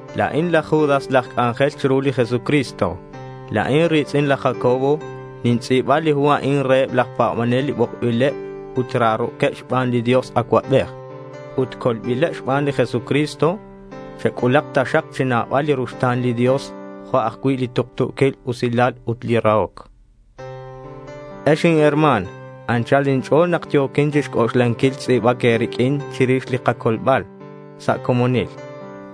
La̱in laj Judas, laj c'anjel chiru li Jesucristo. La̱in ri̱tz'in laj Jacobo. Nintz'i̱ba li hu a'in reheb laj pa̱banel, li bokbileb ut raro̱queb xban li Dios Acuabej ut colbileb xban li Jesucristo. Chec'ulak taxak chi nabal li ruxta̱n li Dios, jo' ajcui' li tuktu̱quil usilal ut li rahoc. Ex inherma̱n, anchal inch'o̱l nak yo̱quin chixc'oxlanquil tz'i̱bac e̱riq'uin chirix li kacolbal sa' comonil.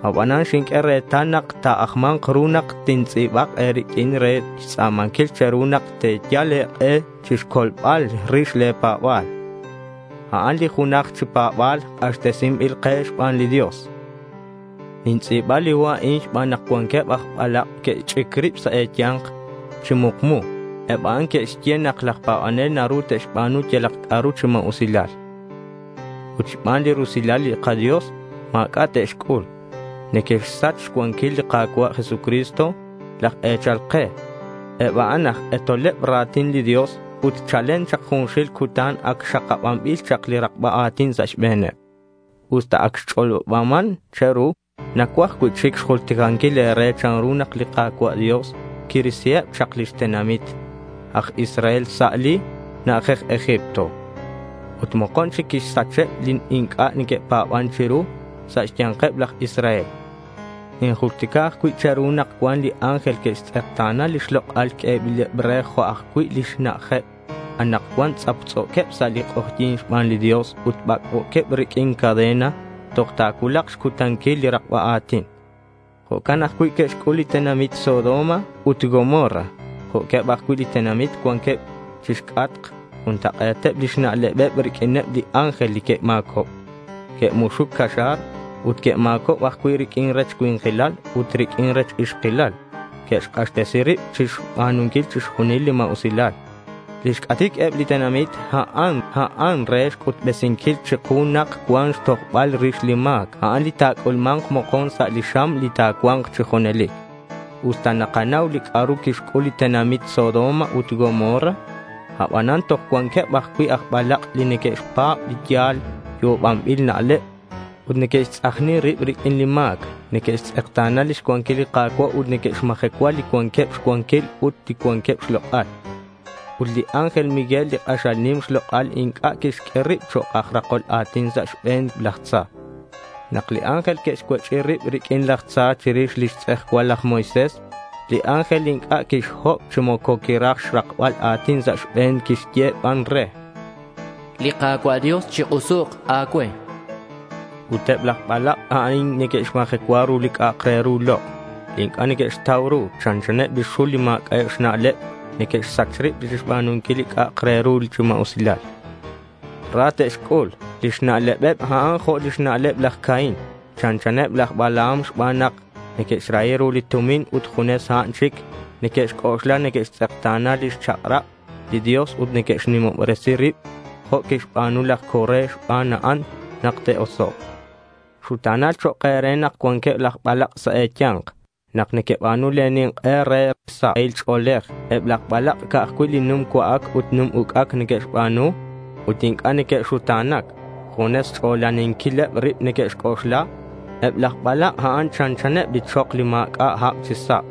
Aban xinq'ue retal nak ta̱ajma̱nk ru nak tintz'i̱bak e̱riq'uin re xtz'a̱manquil che̱ru nak te̱yal e̱k'e chixcolbal rix le̱ pa̱ba̱l. A'an li junaj chi pa̱ba̱l k'axtesinbil chak ke xban li Dios. Nintz'i̱ba li hu a'in xban nak cuanqueb aj balak' que'xch'ic rib sa' e̱ya̱nk chi mukmu. Eb a'an neque'xye nak laj pa̱banel naru te'xba̱nu yalak c'a'ru chi ma̱usilal ut xban li rusilal li kaDios, ma̱c'a' te'xc'ul. Neque'xsach xcuanquil li Ka̱cua' Jesucristo, laj e̱chal ke. Eb a'an aj k'etoleb ra̱tin li Dios ut chalen chak junxil cutan ac xakabanbil chak li rakba a̱tin sa' xbe̱neb. Usta ac xch'olobaman che̱ru, nacuaj cui'chic xjulticanquil e̱re chanru nak li Ka̱cua' Dios quirisiheb chak lix tenamit aj Israel sa' li na'ajej Egipto. Ut mokon chic quixsacheb li inc'a' que'pa̱ban chiru sa' xya̱nkeb laj Israel. Ninjultica ajcui' che̱ru nak cuan li ángel que'xtz'ekta̱na lix lok'al q'uebileb re jo' ajcui' lix na'ajeb. Anakcuan tz'aptz'o̱queb sa' li k'ojyi̱n xban li Dios ut bac'bo̱queb riq'uin cadena toj ta̱cuulak xcutanquil li rakba a̱tin. Jo'can ajcui' que'xc'ul li tenamit Sodoma ut Gomorra jo'queb ajcui' li tenamit cuanqueb chixc'atk. Juntak'e̱teb lix na'lebeb riq'uineb li ángel li que'ma̱cob. Que'muxuc caxa̱r ut que'ma̱cob ajcui' riq'uin rech cui̱nkilal ut riq'uin rech ixkilal. Que'xk'axtesi rib chixba̱nunquil chixjunil li ma̱usilal. Lix c'atic eb li tenamit a'an, a'an re xc'utbesinquil chiku nak cuan xtojbal rix li ma̱c. A'an li ta̱c'ulma̱nk mokon sa' li xam li ta̱cua̱nk chi junelic. Usta nanauman li c'a'ru quixc'ul li tenamit Sodoma ut Gomorra, abanan toj cuanqueb ajcui' aj balak' li neque'xpa̱b li yal yo'obanbil na'leb. Ut neque'xtz'ajni rib riq'uin li ma̱c. Neque'xtz'ekta̱na lix cuanquil li Ka̱cua' ut neque'xmajecua li cuanqueb xcuanquil ut li cuanqueb xlok'al. Ut li ángel Miguel, li k'axal nim xlok'al, inc'a' quixq'ue rib chok' aj rakol a̱tin sa' xbe̱n laj tza. Nak li ángel que'xcuech'i rib riq'uin laj tza chirix lix tz'ejcual laj Moisés, li ángel inc'a' quixhob chi moco quiraj xrakbal a̱tin sa' xbe̱n. Quixye ban re: Li Ka̱cua' Dios chik'usuk a̱cue, chan. Ut eb laj balak' a'in neque'xmajecua ru li c'a'ak re ru lok', li inc'a' neque'xtau ru. Chanchaneb li xul li ma̱c'a'eb xna'leb. Neque'xsach rib chixba̱nunquil li c'a'ak re ru chi ma̱usilal. Ra te'xc'ul. Lix na'lebeb a'an jo' lix na'leb laj Caín. Chanchaneb laj Balaam, xban nak neque'xrahi ru li tumin ut junes a'an chic neque'xc'oxla. Neque'xtz'ekta̱na lix chak'rab li Dios ut neque'xnimobresi rib jo' quixba̱nu laj Coré. Xban a'an nak te'osok'. Xuta̱nal chok' e̱re nak cuanqueb laj balak' sa' e̱ya̱nk nak nequeba̱nu le̱ nink'e re sahil ch'o̱lej. Eb laj balak' ca'aj cui' li num cua'ac ut num uc'ac neque'xba̱nu ut inc'a' neque'xuta̱nac. Junes xch'olaninquileb rib neque'xc'oxla. Eb laj balak' a'an chanchaneb li chok li ma̱c'a' hab chi sa',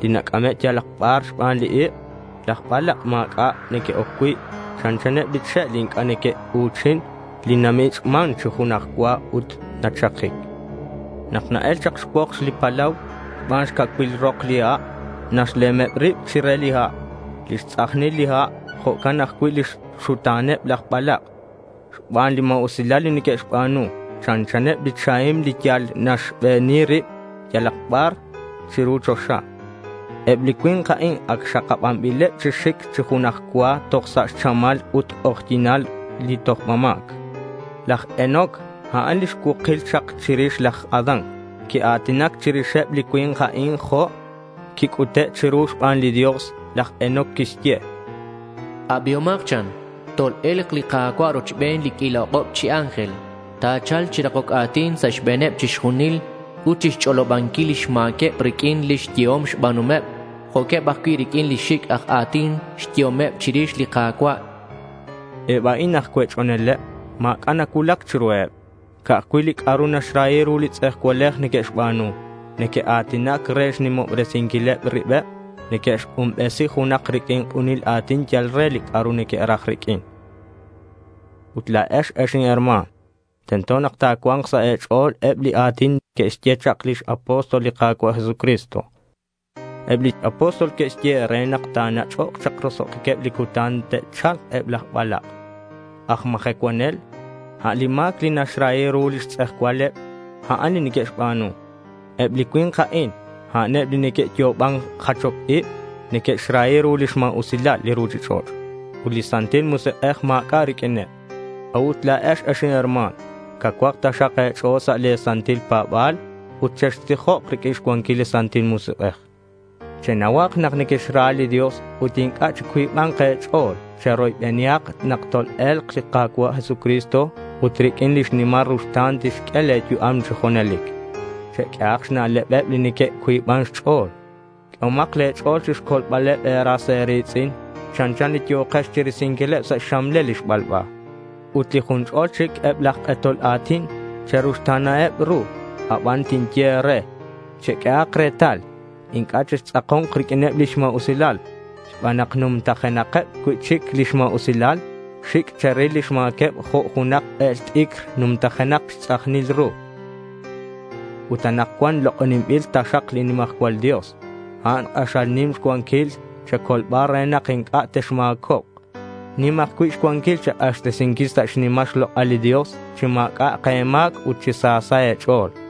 li nac'ame' yalak bar xban li ik'. Laj balak' ma̱c'a' neque'oc cui'. Chanchaneb li che' li inc'a' neque'u̱chin, li namich'man chi junaj cua ut nachakic. Nak na-el chak xcuokx li palau xban xcacuil rok li ha', nalemeb rib chire li ha' lix tz'ajnil li ha'. Jo'can ajcui' lix xuta̱neb laj balak' xban li ma̱usilal li neque'xba̱nu. Chanchaneb li chahim li yal naxbeni rib yalak bar chiru choxa. Eb li cui̱nk a'in ac xakabanbileb chi xic chi junaj cua toj sa' xchamal ut xk'ojyi̱nal li tojba ma̱c. Laj Enoc, a'an lix cuukil chak chirix laj Adán. Quia̱tinac chirixeb li cui̱nk a'in jo' quic'ute' chiru xban li Dios. Laj Enoc quixye: —Abihomak, chan. Tol-e̱lk li Ka̱cua' rochben li q'uila ok'ob chi ángel. Ta̱cha̱lk chi rakoc a̱tin sa' xbe̱neb chixjunil ut chixch'olobanquil lix ma̱queb riq'uin lix yehom xba̱nuhomeb jo' eb ajcui' riq'uin li xic' aj a̱tin xyehomeb chirix li Ka̱cua', chan laj Enoc. Eb a'in aj cuech'oneleb. Ma̱c'a' nacuulac chiruheb. Ca'aj cui' li c'a'ru naxrahi ru li tz'ejcualej neque'xba̱nu. Neque'a̱tinac re xnimobresinquileb ribeb. Neque'xk'unbesi junak riq'uin k'unil a̱tin yal re li c'a'ru neque'raj riq'uin. Ut la̱ex ex inherma̱n, tento nak ta̱cua̱nk sa' e̱ch'o̱l eb li a̱tin li que'xye chak lix apóstol li Ka̱cua' Jesucristo. Eb li apóstol que'xye e̱re nak ta̱nach'ok chak roso'jiqueb li cutan te'cha̱lk eb laj balak' aj majecuanel. A' li ma̱c li naxrahi ru lix tz'ejcualeb, a'an li neque'xba̱nu. Eb li cui̱nk a'in, a'aneb li neque'yo'oban jachoc ib. Neque'xrahi ru lix ma̱usilal li ruchich'och' ut li Santil Musik'ej ma̱c'a' riq'uineb. A'ut la̱ex, ex inherma̱n, cauhak taxak e̱ch'o̱l sa' le̱ santil pa̱ba̱l. Ut chextijok riq'uin xcuanquil li Santil Musik'ej. Chenauhak nak nequexra li Dios ut inc'a' chicuiba̱nk e̱ch'o̱l. Cheroybenihak nak tol-e̱lk li Ka̱cua' Jesucristo ut riq'uin lix nimal ruxta̱n tixq'ue le̱ yu'am chi junelic. Cheq'uehak xna'lebeb li neque'cuiban xch'o̱l. Q'uehomak le̱ ch'o̱l chixcolbal e̱ras e̱ri̱tz'in. Chanchan li yo̱kex chirisinquileb sa' xxamlel li xbalba. Ut li jun ch'ol chic eb laj k'etol a̱tin, cheruxta̱naheb ru aban tinye e̱re: cheq'uehak retal. Inc'a' chextz'ako̱nk riq'uineb lix ma̱usilal xban nak numtajenakeb cui'chic lix ma̱usilal. Xic' cheril lix ma̱queb jo' junak k'el t'icr numtajenak xtz'ajnil ru. Ut anakcuan lok'oninbil taxak li nimajcual Dios. A'an k'axal nim xcuanquil che̱colbal re nak inc'a' texma̱cobk. Nim ajcui' xcuanquil che̱k'axtesinquil sa' xnimal xlok'al li Dios chi ma̱c'a'ak e̱ma̱c ut chi sa sa' e̱ch'o̱l.